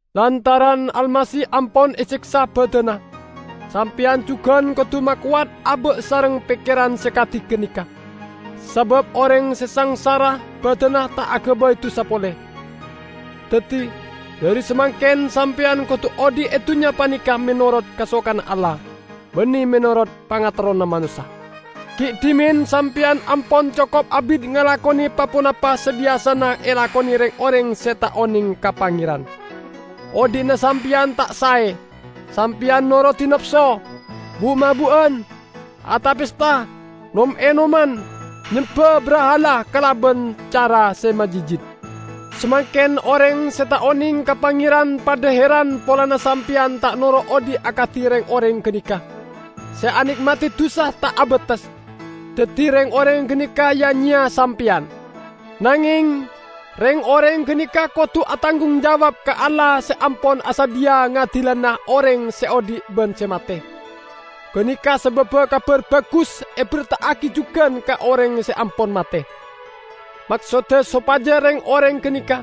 Lantaran Almasih ampon eseksa badanna, sampeyan jugan kodu makowat aba' sareng pekkeran se kadi ganeka. Sabab oreng se sangsara badanna ta' agabay dusa pole. Daddi, dhari samangken sampeyan kodu odhi' e dunnya paneka menorot kasokanna Allah, banne menorot pangaterrona manossa. Gi' dhimen sampeyan ampon cokop abit ngalakone pa-ponapa se biyasana elakone reng-oreng se ta' oneng ka Pangeran. Odhi'na sampeyan ta' sae. Sampeyan norodi napso, bu'-mabu'an, ata-pesta, nom-enoman, nyemba brahala kalaban cara se majitjit. Samangken oreng se ta' oneng ka Pangeran padha heran polana sampeyan ta' noro' odhi' akadi reng-oreng ganeka, se ane'madi dusa ta' abates. Daddi reng-oreng ganeka ya-nyeya sampeyan. Nangeng, reng-oreng ganeka kodu atanggung jawab ka Allah se ampon asadhiya ngadilana oreng se odhi' ban se mate. Ganeka sababba Kabar Bagus eberta'agi jugan ka oreng se ampon mate. Maksodda sopaja reng-oreng ganeka,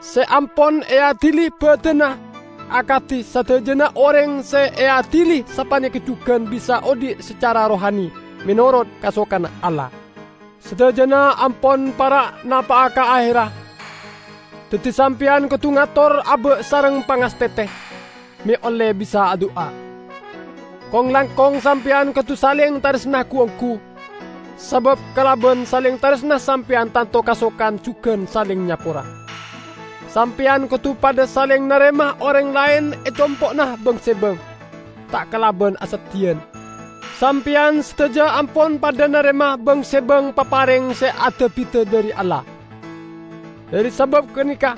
se ampon eadili badanna -- akadi sadajana oreng se eadili sapaneka jugan -- bisa odhi' sacara rohani, menorot kasokanna Allah. Sadajana ampon para' napa'a ka aherra, daddi sampeyan kodu ngator aba' sareng pangastete, me' olle bisa adu'a. Kong-langkong sampeyan kodu saleng taresna gu-onggu, sabab kalaban saleng taresna sampeyan tanto kasokan jugan saleng nyapora. Sampeyan kodu padha saleng narema oreng laen e compo'na bang-sebang, ta' kalaban aseddhiyan. Sampeyan sadaja ampon padha narema bang-sebang papareng se ada-bida dhari Allah. Dhari sabab ganeka,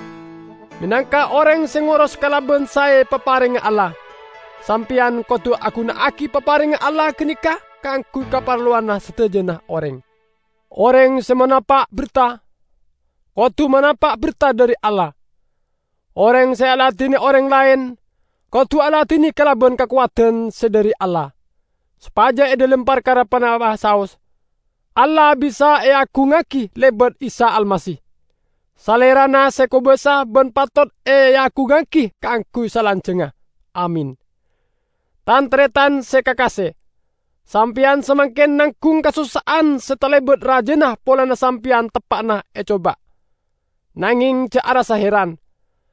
menangka oreng se ngoros kalaban sae paparengnga Allah, sampeyan kodu aguna'agi paparengnga Allah ganeka kaangguy kaparlowanna sadajana oreng. Oreng se manapa' berta, kodu manapa' berta dhari Allah; oreng se aladine oreng laen, kodu aladine kalaban kakowadan se dhari Allah; sopaja e dhalem parkara ponapa'a saos, Allah bisa eagungngagi lebat Isa Almasih. Salerana se kobasa ban patot eagungngagi kaangguy salanjangnga. Amin. Tan-taretan se kakase! Sampeyan samangken nanggung kasossa'an se talebat rajana polana sampeyan teppa'na ecoba. Nangeng ja' arassa heran,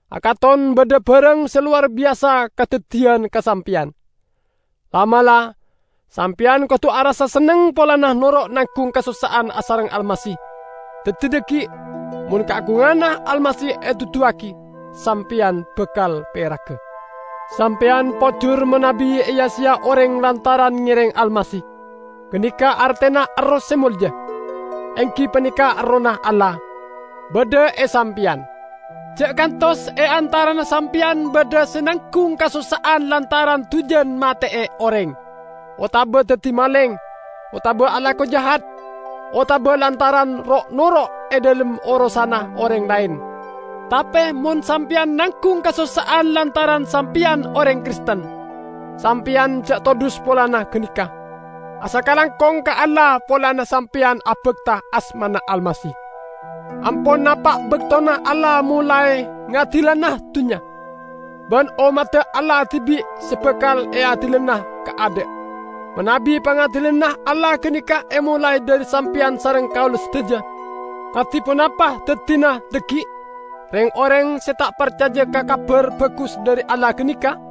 akaton badha barang se lowar biyasa kadaddiyan ka sampeyan. La'-mala', sampeyan kodu arassa senneng polana noro' nanggung kasossa'an asareng Almasih. Daddi dhaggi', mon kaagunganna Almasih eduduwagi, sampeyan bakal peraga. Sampeyan pojur manabi eya-seya oreng lantaran ngereng Almasih. Ganeka artena Erroh se molja, enggi paneka Errohna Allah, badha e sampeyan. Ja' kantos e antarana sampeyan badha se nanggung kasossa'an lantaran dujan mate'e oreng, otaba daddi maleng, otaba alako jahat, otaba lantaran ro'-noro' e dhalem orosanna oreng laen. Tape mon sampeyan nanggung kasossa'an lantaran sampeyan oreng Kristen, sampeyan ja' todhus polana ganeka. Asakalangkong ka Allah polana sampeyan abakta asmana Almasih. Ampon napa' baktona Allah molae ngadilana dunnya, ban ommadda Allah dibi' se bakal eadilana kaadha'. Manabi pangadilanna Allah ganeka emolae dhari sampeyan sareng kaula sadaja, kadi ponapa daddina dhaggi' reng-oreng se ta' parcaja ka Kabar Bagus dhari Allah ganeka?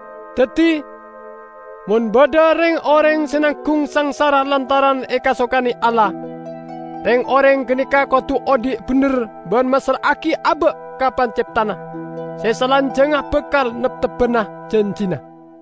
Daddi, mon badha reng-oreng se nanggung sangsara lantaran ekasokane Allah, reng-oreng ganeka kodu odhi' bendher ban massra'agi aba' ka Panceptana, se salanjangnga bakal neptebbana janjina.